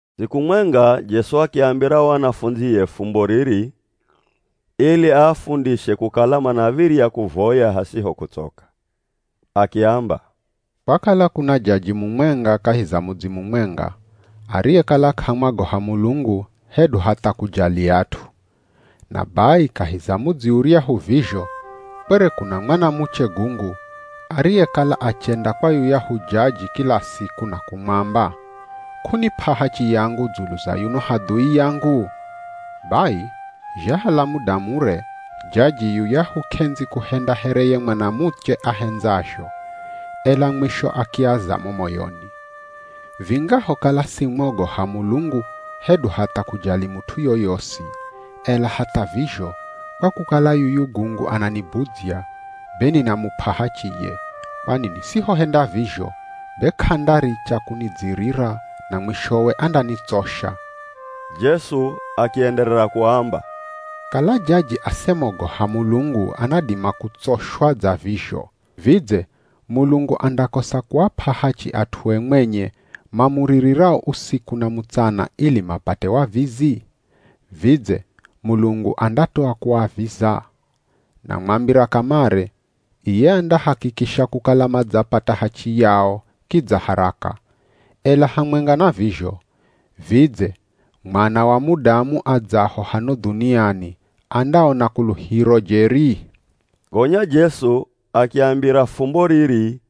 Siku mwenga Jesu akiambira o anafundzie fumbo riri, ili aafundishe kukala manav̱irya kuvoya hasiho kutsoka. Akiamba, “Kwakala kuna jaji mumwenga kahi za mudzi mumwenga ariyekala k'amwagoha Mulungu hedu hatha kujali at'u. Na bai kahi za mudzi uryahu vizho kwere kuna mwanamuche gungu ariyekala achenda kwa yuyahu jaji kila siku na kumwamba, ‘K'unip'a hachi yangu dzulu za yuno hadhui yangu?’ Bai zhahala muda mure, jaji yuyahu k'endzi kuhenda here ye mwanamuche ahendzazho, ela mwisho akiaza mo moyoni, ‘Vingahokala simwogoha Mulungu hedu hatha kujali mut'u yoyosi, ela hatha vizho kwa kukala yuyu gungu ananibudzya, be ninamup'a hachiye, kwani nisihohenda vizho be k'andaricha kunidzirira na mwishowe andanitsosha!’” Jesu akienderera kuamba, “Kala jaji asemogoha Mulungu anadima kutsoshwa dza vizho. Vidze Mulungu andakosa kuap'a hachi at'ue mwenye, mamuririrao usiku na mutsana ili mapate wavizi? Vidze Mulungu andatoa kuaviza? Namwambira kamare, iye andahakikisha kukala madzapata hachi yao kidza haraka. Ela hamwenga na vizho, vidze Mwana wa Mudamu adzaho hano dhuniani andaona kuluhiro jeri?” Gonya Jesu akiambira fumbo riri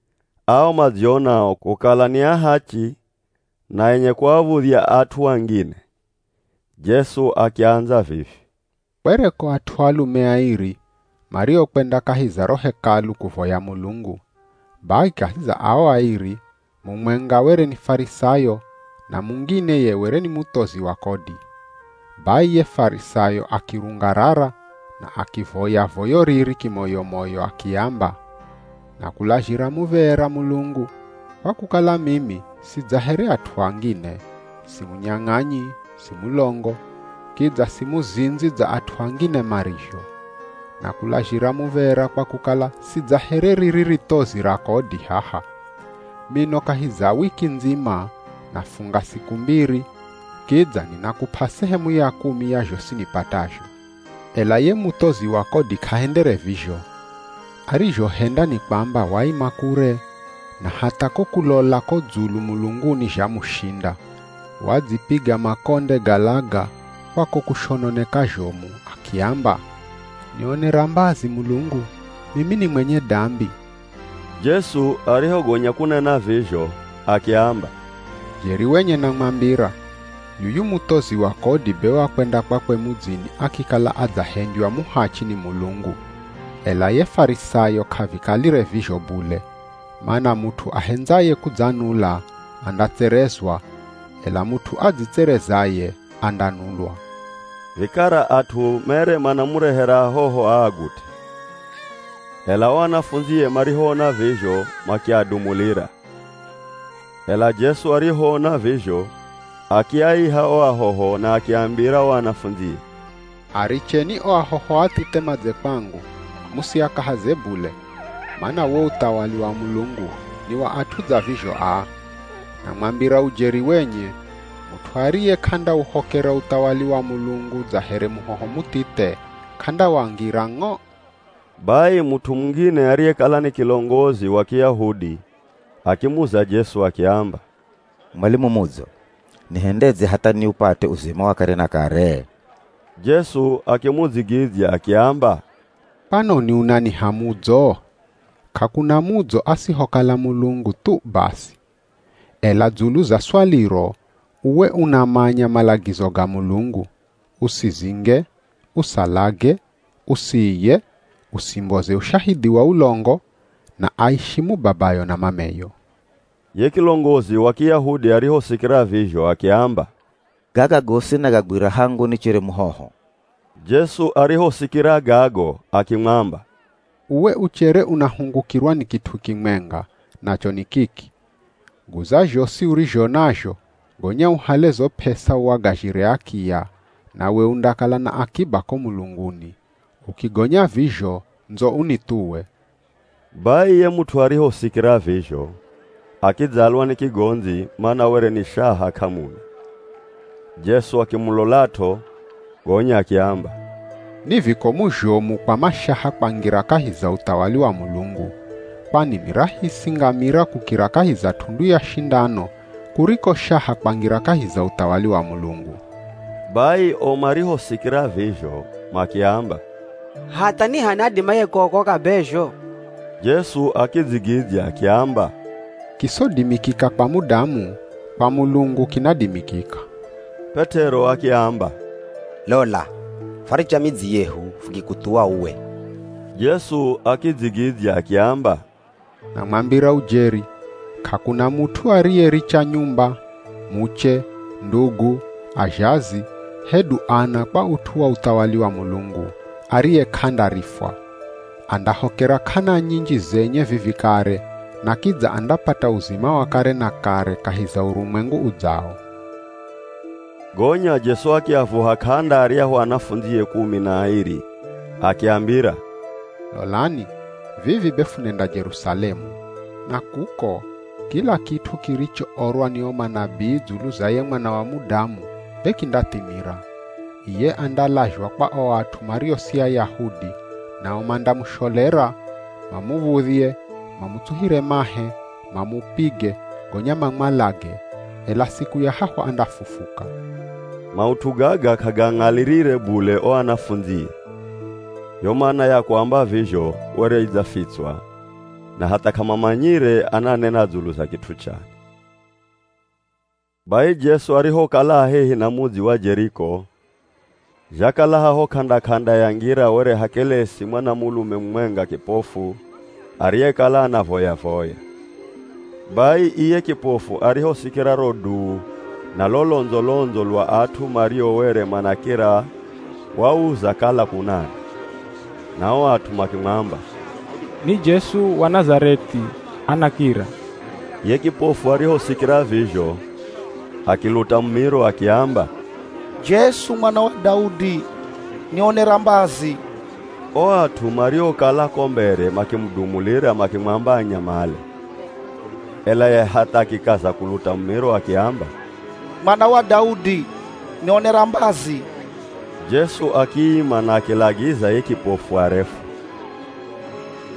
ao madzionao kukala ni ahachi na enye kuav̱udhya at'u angine. Jesu akiandza vivi, “Kwereko at'u alume airi mariokwenda kahi za ro Hekalu kuvoya Mulungu, bai kahi za ao airi, mumwenga were ni Farisayo na mungine ye were ni muthozi wa kodi. Bai ye Farisayo akirungarara na akivoya voyo riri kimoyo-moyo akiamba, ‘Nakulazhira muv̱era Mulungu, kwa kukala mimi si dza here at'u angine, si munyang'anyi, si mulongo, kidza si muzindzi dza at'u angine marizho. Nakulazhira muv̱era kwa kukala si dza here riri rithozi ra kodi haha. Mino kahi za wiki ndzima, nafunga siku mbiri, kidza ninakup'a sehemu ya kumi ya zhosi nipatazho.’ Ela ye muthozi wa kodi k'ahendere vizho, arizhohenda ni kwamba waima kure, na hatha ko kulola ko dzulu mulunguni zhamushinda. Wadzipiga makonde ga laga kwa ko kushononeka zhomu akiamba, ‘Nionera mbazi Mulungu, mimi ni mwenye dambi!’” Jesu arihogonya kunena vizho, akiamba, “Jeri wenye namwambira, yuyu muthozi wa kodi be wakwenda kwakwe mudzini akikala adzahendywa muhachi ni Mulungu, ela ye Farisayo k'avikalire vizho bule, mana mut'u ahendzaye kudzanula, andatserezwa, ela mut'u adzitserezaye andanulwa.” Vikara at'u mere manamurehera ahoho aagut'e. Ela o anafundzie marihoona vizho makiadumulira. Ela Jesu arihoona vizho, akiaiha o ahoho na akiambira o anafundzie, “Aricheni o ahoho athithe madze kwangu, musiakahaze bule, mana wo uthawali wa Mulungu ni wa at'u dza vizho aa. Namwambira ujeri wenye, mut'u ariye k'andauhokera uthawali wa Mulungu dza here muhoho muthithe, k'andawangira ng'o.” Bai mut'u mungine ariyekala ni kilongozi wa Kiyahudi akimuza Jesu akiamba, “Mwalimu mudzo, nihendedze hatha niupate uzima wa kare na kare?” Jesu akimudzigidzya akiamba, “Kwanoni unaniha mudzo? K'akuna mudzo asihokala Mulungu thu basi.” Ela dzulu za swaliro, uwe unamanya malagizo ga Mulungu, “Usizinge, usalage, usiiye, usimboze ushahidhi wa ulongo, na aishimu babayo na mameyo.” Ye kilongozi wa Kiyahudi arihosikira vizho akiamba, “Gaga gosi nagagwira hangu nichere muhoho.” Jesu arihosikira gago akimwamba, “Uwe uchere unahungukirwa ni kit'u kimwenga, nacho ni kiki, guza zhosi urizho nazho, gonya uhale zo p'esa uagazhire akiya, nawe undakala na akiba ko mulunguni. Ukigonya vizho ndzo unithuwe.” Bai ye mut'u arihosikira vizho, akidzalwa ni kigondzi, mana were ni shaha k'amuna. Jesu akimulolat'o, gonya akiamba, “Ni vikomu zhomu kwa mashaha kwangira kahi za uthawali wa Mulungu. Kwani ni rahisi ngamira kukira kahi za t'undu ya shindano kuriko shaha kwangira kahi za uthawali wa Mulungu.” Bai o marihosikira vizho makiamba, “Hatha ni h'ani adimaye kuokoka be zho?” Jesu akidzigidzya akiamba, “Kisodimikika kwa mudamu, kwa Mulungu kinadimikika.” P'et'ero akiamba, “Lola, fwaricha midzi yehu fukikuthuwa uwe.” Jesu akidzigidzya akiamba, “Namwambira ujeri, k'akuna mut'u ariyericha nyumba, muche, ndugu, azhazi, hedu ana kwa ut'u wa uthawali wa Mulungu, ariye k'andarifwa. Andahokera k'ana nyinji zenye vivi kare, na kidza andapata uzima wa kare na kare kahi za urumwengu udzawo.” Gonya Jesu akiavuha k'anda aryahu anafundzie kumi na airi akiambira, “Lolani vivi be funenda Jerusalemu. Na kuko, kila kit'u kirichoorwa ni o manabii dzulu za ye Mwana wa Mudamu be kindathimira. Iye andalazhwa kwa o at'u mario si Ayahudi, nao mandamusholera, mamuv̱udhye, mamutsuhire mahe, mamupige, gonya mamwalage, ela siku ya hahu andafufuka. Maut'u gaga k'agaang'alirire bule o anafundzie. Yo mana ya kuamba vizho were idzafitswa, na hatha k'amamanyire ananena dzulu za kit'u chani.” Bai Jesu arihokala a hehi na mudzi wa Jeriko, zhakala haho k'anda-k'anda ya ngira were hakelesi mwanamulume mumwenga kipofu ariyekala anavoya-voya. Bai iye kipofu arihosikira ro duu na lo londzo-londzo lwa at'u mario were manakira wauza kala kunani. Na o at'u makimwamba, “Ni Jesu wa Nazareth'i, anakira.” Ye kipofu arihosikira vizho, akiluta mumiro akiamba, “Jesu Mwana wa Daudi, nionera mbazi!” O at'u mariokala ko mbere makimudumulira makimwamba anyamale. Ela ye hatha akikaza kuluta mumiro akiamba, “Mwana wa Daudi, nionera mbazi!” Jesu akiima na akilagiza ye kipofu arefwe.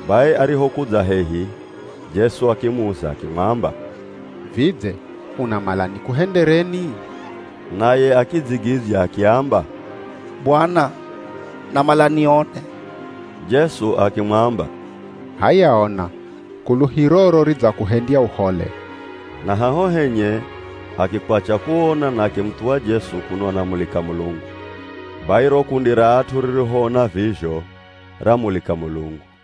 Bai arihokudza hehi Jesu akimuza akimwamba, “Vidze unamala nikuhendereni?” Naye akidzigidzya akiamba, “Bwana, namala nione.” Jesu akimwamba, “H'aya ona! Kuluhiroro ridzakuhendya uhole.” Na haho henye, akikwacha kuona na akimuthuwa Jesu kuno anamulika Mulungu. Bai ro kundi ra at'u ririhoona vizho, ramulika Mulungu.